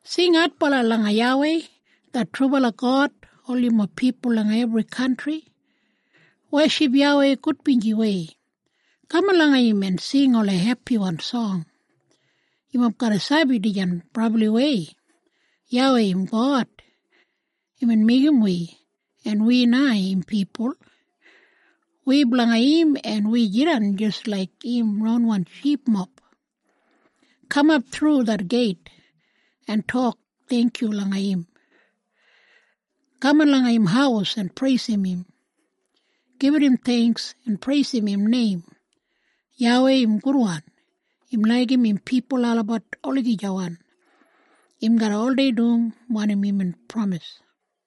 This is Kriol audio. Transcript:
Sing adbala langa YAWEI det trubala God, ol yumob pipul langa ebri kantri! Weship YAWEI gudbinjiwei. Kaman langa im en sing ola hepiwan song! Yumob garra sabi dijan brabliwei. YAWEI im God. Imbin meigim wi, en wi na im pipul. Wi blanga im en wi jidan jis laik im ronwan shipmob. Kamap thru det geit en tok theingkyu langa im. Kaman langa im haus en preisim im. Gibit im theingks en preisim im neim. YAWEI im gudwan. Im laigim im pipul olabat olagijawan. Im garra oldei dum wanim imbin pramis.